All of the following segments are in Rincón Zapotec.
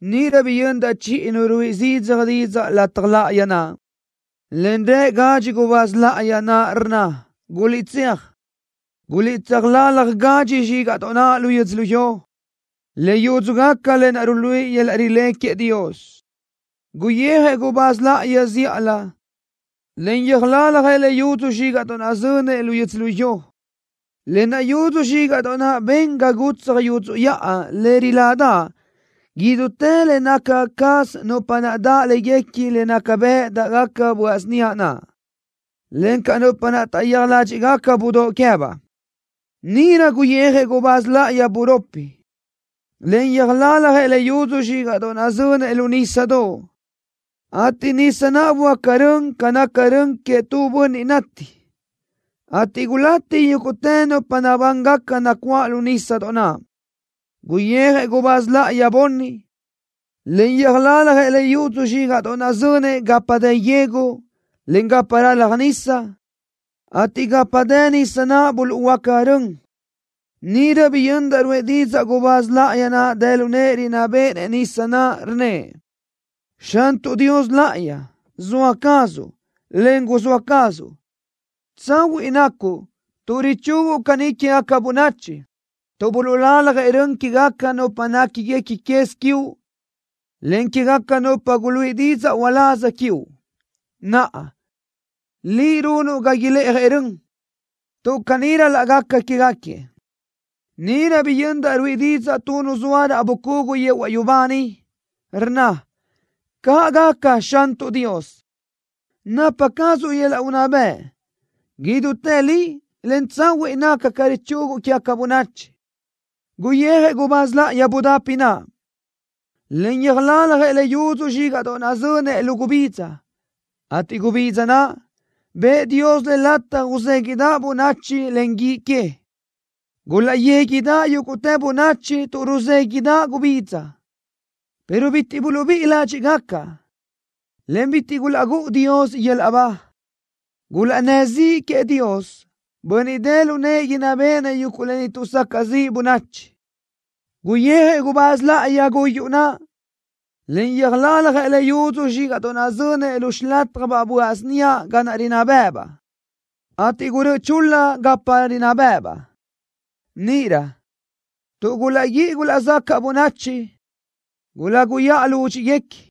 Níʼirö biyöndaʼ chiʼi nu ruíʼi zidzaj didzaʼ lataj láʼayi naʼ, en rë gadxi gubáz láʼayi naʼ, rnna: “¡Guliʼtséaj! ¡Guliʼtsöjlálaj gadxi zxígaʼdoʼ naʼ lu yödzölió, le yúdzugaca lë naʼ ruluíʼi yöl-laʼ rilé queëʼ Dios!” Guyijëʼ gubáz láʼayi zíʼalö, en yöjlaljëʼ le yudzu zxígaʼdoʼ naʼ zönëʼ lu yödzölió. Lë naʼ yudzu zxígaʼdoʼ naʼ ben ga gutsaj yudzuʼ yaʼa le riládaʼ idútë le naca caz nupa naʼ daʼ léguequi le naca bëʼ dáʼgaca böaʼ síniaʼ naʼ, encaʼ nupa naʼ taʼyéaj ládxiʼgaca budóʼ queë́baʼ. Níʼirö guyijëʼ gubáz láʼayi buropi, en yöjlaljëʼ le yudzu zxígaʼdoʼ naʼ zönëʼ lu nísadoʼ, ateʼ nisa naʼ böáca rön ca naca rön queëʼ tu bönniʼ nati, ateʼ gulati yúguʼtë nupa nabángaca nacuáʼ lu nísadoʼ naʼ. Guyijëʼ gubáz láʼayi bunni, en yöjlaljëʼ le yudzu zxígaʼdoʼ naʼ zönëʼ gapa dë yegu, en gapa ralaj nisa, ateʼ gapa dë nisa naʼ buluʼhuöáca rön. Níʼirö biyöndaʼ ruʼë didzaʼ gubáz láʼayi naʼ dë lu nëʼë rinná béʼenëʼ nisa naʼ, rnnëʼ: “¡Xantuʼ Dios Láʼayi! ¡Zoa cazuʼ, en guzóa cazuʼ! ¡Tsahuiʼ nacuʼ tuʼ richuguʼ caní quégaca bönachi tuʼ buluʼlaljëʼ rön quégaca nupa néquiguequi quez quiuʼ, en quégaca nupa guluíʼi didzaʼ uláz quiuʼ! ¡Naʼa, Liʼ runuʼ ga ilë́ʼajëʼ rön, tuʼ caní ral-laʼ gaca quégaquiëʼ!” Níʼirö biyöndaʼ ruíʼi didzaʼ tu nu zoa raʼ bucugu yehuaʼ yubá niʼ, rnna: “¡Caʼ gaca, Xantuʼ Dios, napa cazuʼ yöl-laʼ unná bëʼ! ¡Idútë li, en tsahuiʼ naca ca richuguʼ quégaca bönachi!” Guyijëʼ gubáz láʼayi budapi naʼ, en yöjlaljëʼ le yudzu zxígaʼdoʼ naʼ zönëʼ lu gubidza, ateʼ gubidza naʼ, bëʼë Dios le lataj uzéguiʼdaʼ bönachi len guíʼ que. Gulaʼyéguiʼdaʼ yúguʼtë bönachi tu ruzéguiʼdaʼ gubidza, pero bitiʼ buluʼbíʼi ládxiʼgaca, en bitiʼ gulaʼgúʼu Dios yöl-laʼ ba. Gulaʼnnë́ ziʼi queëʼ Dios, Bönniʼ dë lu nëʼë inná béʼenëʼ yuguʼ lë ni tuʼsacaʼ ziʼ bönachi. Guyijëʼ gubáz láʼayi guyuʼ naʼ, en yöjlaljëʼ le yudzu zxígaʼdoʼ zönëʼ lu xilataj böaʼ síniaʼ ga naʼ rinná bë́ʼëbaʼ, ateʼ gurö́ʼö chul-la gapa rinná bë́ʼëbaʼ. Níʼirö, tuʼ gulaʼguíʼi gulaʼzacaʼ bönachi, guláguyaʼa lúdxiʼguequi,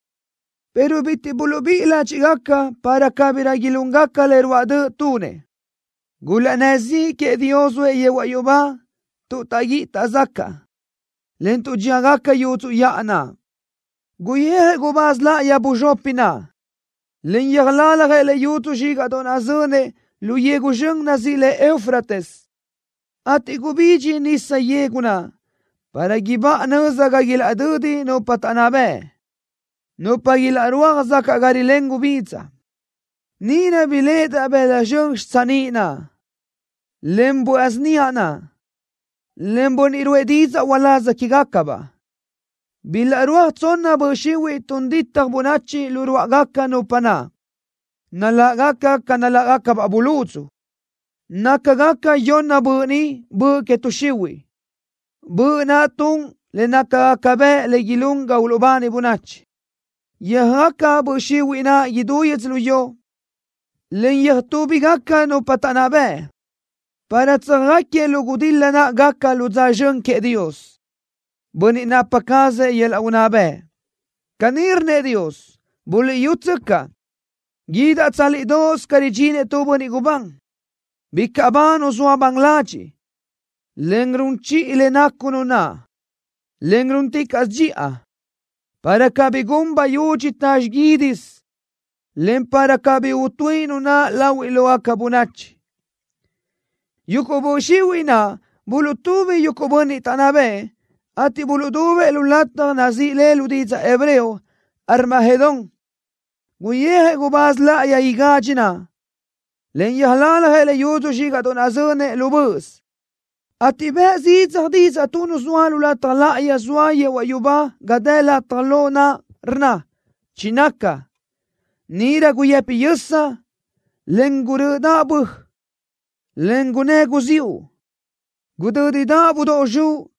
pero bitiʼ buluʼbíʼi ládxiʼgaca para cabirö ilúngaca le ruáʼ döʼ tunëʼ. Gulaʼnnë́ ziʼi queëʼ Dios zoëʼ yehuaʼ yubá tuʼ taʼguíʼi taʼzacaʼ, en tuʼ dxíagaca yudzuʼ yaʼa naʼ. Guyijëʼ gubáz láʼayi buzxopi naʼ, en yöjlaljëʼ le yudzu zxígaʼdoʼ naʼ zönëʼ lu yegu zxön nazíʼi le Eufrates, ateʼ gubidxi nisa yegu naʼ para ibáʼa nöza ga ilaʼdödi nupa taʼnná bëʼ, nupa ilaʼrúaj zacaʼ ga rilén gubidza. Níʼirö biléʼedaʼ bëla zxön xitsiníʼ naʼ, en böaʼ síniaʼ naʼ, en bönniʼ ruʼë didzaʼ uláz quégacabaʼ. Bilaʼrúaj tsonna böʼ xihuiʼ tun ditaj bönachi lu ruáʼagaca nupa naʼ. Naláʼgaca ca naláʼgacabaʼ buludzu. Nácagaca yonna böʼ ni böʼ que tuʼ xihuiʼ, böʼ naʼ tun le nácagaca bëʼ le ilún ga uluʼbani bönachi. Yöjaca böʼ xihuiʼ naʼ idú yödzölió, en yöjtúbigaca nupa taʼnná bëʼ, para tsöjáquiëʼ lu gudil-la naʼ gaca lu dza zxön queëʼ Dios, Bönniʼ napa cazëʼ yöl-laʼ unná bëʼ. Caní rnnëʼ Dios: “¡Buliʼyútsöcaʼ! Guídaʼ tsálidoʼos ca ridxinëʼ tu bönniʼ gubán. Bicaʼ ba nu zoa ban ladxiʼ, en run chiʼi le nacu nu naʼ, en rúnticaʼsö dxiʼa, para cabí gun bayudxi ta xiguídisö, en para cabí utuíʼi nu naʼ lahuiʼ lógaca bönachi.” Yuguʼ böʼ xihuiʼ naʼ buluʼtubi yuguʼ bönniʼ taʼnná bëʼë, ateʼ buluʼdubëʼ tu lataj nazíʼi le lu didzaʼ hebreo: Armagedón. Guyijëʼ gubáz láʼayi igadxi naʼ, en yöjlaljëʼ le yudzu zxígaʼdoʼ naʼ zönëʼ lu böʼös, ateʼ bëʼ zidzaj didzaʼ tu nu zoa lu lataj láʼayi zoa yehuaʼ yubá ga dë lataj lo naʼ, rnna: “Chinaca.” Níʼirö guyëpi yösa, en gurö́ʼödaʼ bö, en gunnë́ guziúʼ. Gudö́didaʼ budóʼ zxuʼ,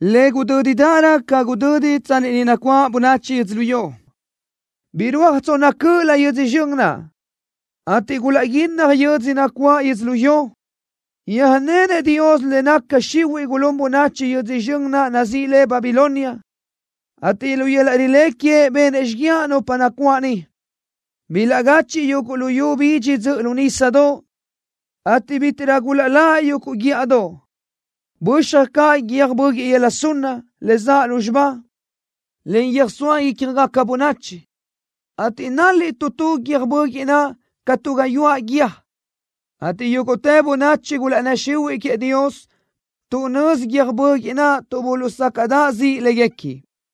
le gudö́didaʼrö ca gudödi tsanni ni nacuáʼ bönachi yödzölió. Birúaj tsonna cö́ʼölö yödzö zxön naʼ, ateʼ gulaʼguínnaj yödzö nacuáʼ yödzölió. Yöjnenëʼ Dios le naca xihuiʼ gulún bönachi yödzö zxön naʼ nazíʼi le Babilonia, ateʼ lu yöl-laʼ rilé queëʼ benëʼ xíguiaʼ nupa nacuáʼ niʼ. Bilaʼgachiʼ yuguʼ luyú bidxi dzöʼö lu nísadoʼ, ateʼ bítiʼrö gulaʼláʼ yuguʼ guíʼadoʼ. Böxaj caʼ guiö́j böguiʼ yöla sunna, le zaʼ lúzxiba, en yöjsóa ícjagaca bönachi, ateʼ nál-liʼ tu tu guiö́j böguiʼ naʼ ca tu gayuáʼ guíë, ateʼ yúguʼtë bönachi gulaʼnnë́ xihuiʼ queëʼ Dios tuʼ nözi guiö́j böguiʼ naʼ tuʼ buluʼsácaʼdaʼ ziʼi léguequi.